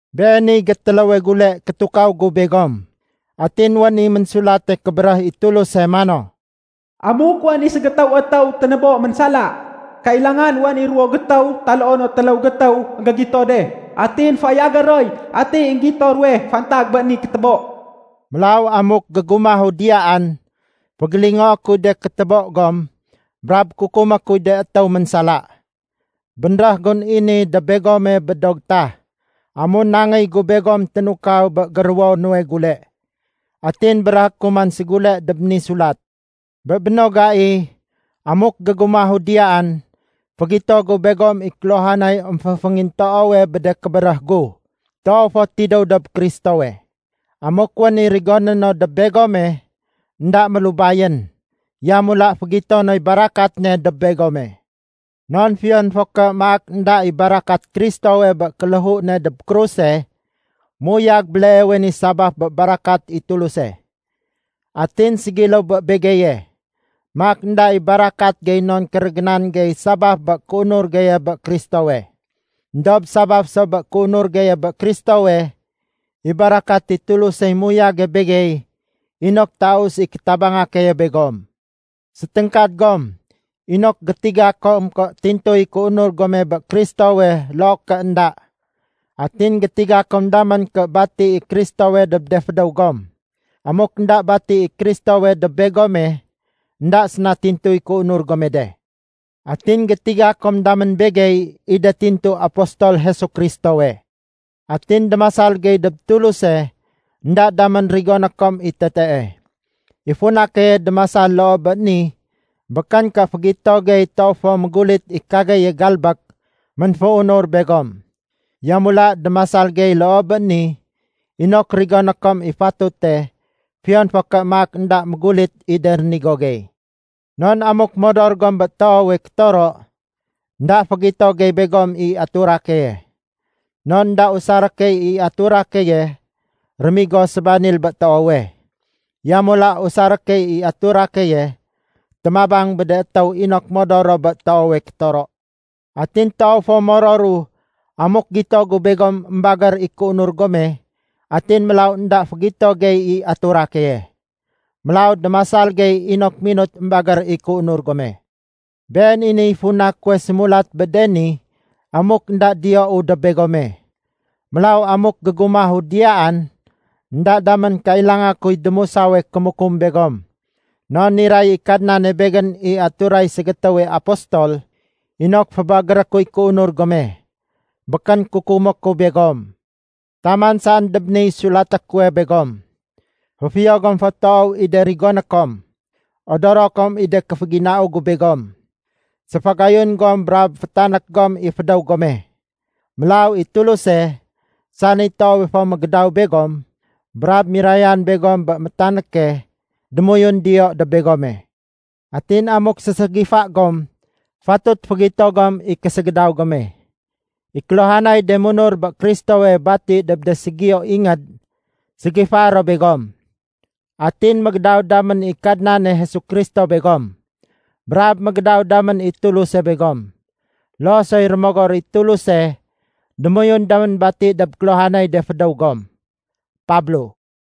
Beeniy gétéléwe gule kétukaw gu begom. Atin wén i Ménsulate Kébéréh i Tuluse mano, “Amuk wén i ségétéw étéw ténébo ménsala, kailangan wén i ruwo gétéw taloo no téléw gétéw énggégito de atin fayagé roy ati énggito ruwe fantag bé ni kétébo.” Mélaw amuk gégumahu diyaan, fégélingoé kuy de kétébo gom brab kukumé kuy de étéw ménsala. Bénréh gun i ni dob begome bé do gétah amun nangéy gu begom ténukaw bé géruwo nuwe gule. Atin béréhé ku man ségule dob ni sulat. Bé béno gai, amuk gégumahu diyaan, fégito gu begom i kéluhanay émféngintoowe bé de kébéréh gu, toow fo tidéw dob Kristowe. Amuk wén i rigoné no dob begome, énda mélubayén, yamula fégito noy barakat ne dob begome. Non fiyon fo ké maak énda i barakat Kristowe bé kéléhu ne dob kruse, méuyag béleewe ni sabaf bé barakat i Tuluse. Atin ségiléw bé begeye, maak énda i barakat gey non kérégénan gey sabaf bé kéunur geye bé Kristowe. Endob sabaf so bé kéunur geye bé Kristowe, i barakat i Tulusey muyage begey inok taus i kétabanga keye begom. Séténgkad gom inok gétiga kom ké tintuy kéunur gome bé Kristowe loo ké énda. Atin gétiga kom damén ké bati i Kristowe dob de fédéw gom. Amuk énda bati i Kristowe dob begome, énda séna tintuy kéunur gome de. Atin gétiga kom damén begey i de tintu apostol Jesu Kristowe. Atin démasal gey dob Tuluse énda damén rigoné kom i tetee. I funa keye démasal loo bé ni békén ké fégito gey toow fo mégulit i kageye galbék ménféunur begom. Yamula démasal gey loo bé ni inok rigoné kom i fatute fiyon fo ké maak énda mégulit i de rénigo gey. Non amuk modor gom bé toowe kétoro, énda fégito gey begom i atura keye. Non énda usaré key i atura keye rémigo sébanil bé toowe, yamula usaré key i atura keye témabang bé de étéw inok modor ro bé toowe kétoro. Atin toow fo mororu amuk gito gu begom émbagér i kéunur gome atin mélaw énda fégito gey i atura keye. Mélaw démasal gey inok minut émbagér i kéunur gome. Been i niy funa kuwe sémulat bé de ni amuk énda diyou dob begome. Mélaw amuk gégumahu diyaan énda damén kailanga kuy démusawe kémukum begom. Non niray i Kadnane begén i aturay ségétéwe apostol inok fébagéré kuy kéunur gome, békén kukumé ku begom. Taman saén dob niy sulaté kuwe begom. Féfiyo gom fo toow i de rigoné kom, odoro kom i de kéféginau gu begom. Séfagayun gom brab fétanék gom i fédéw gome. Mélaw i Tuluse, sani toowe fo mégédaw begom brab mirayan begom bé métanéke, démoyun diyo dob begome. Atin amuk séségifa gom fatut fégito gom i késégédaw gome. I kéluhanay de munur bé Kristowe bati dob de ségiyo ingéd ségifaé ro begom. Atin mégédaw damén i Kadnane Jesu Kristo begom, brab mégédaw damén i Tuluse begom, loo soy Rémogor i Tuluse démoyun damén bati dob kéluhanay de fédéw gom. Pablo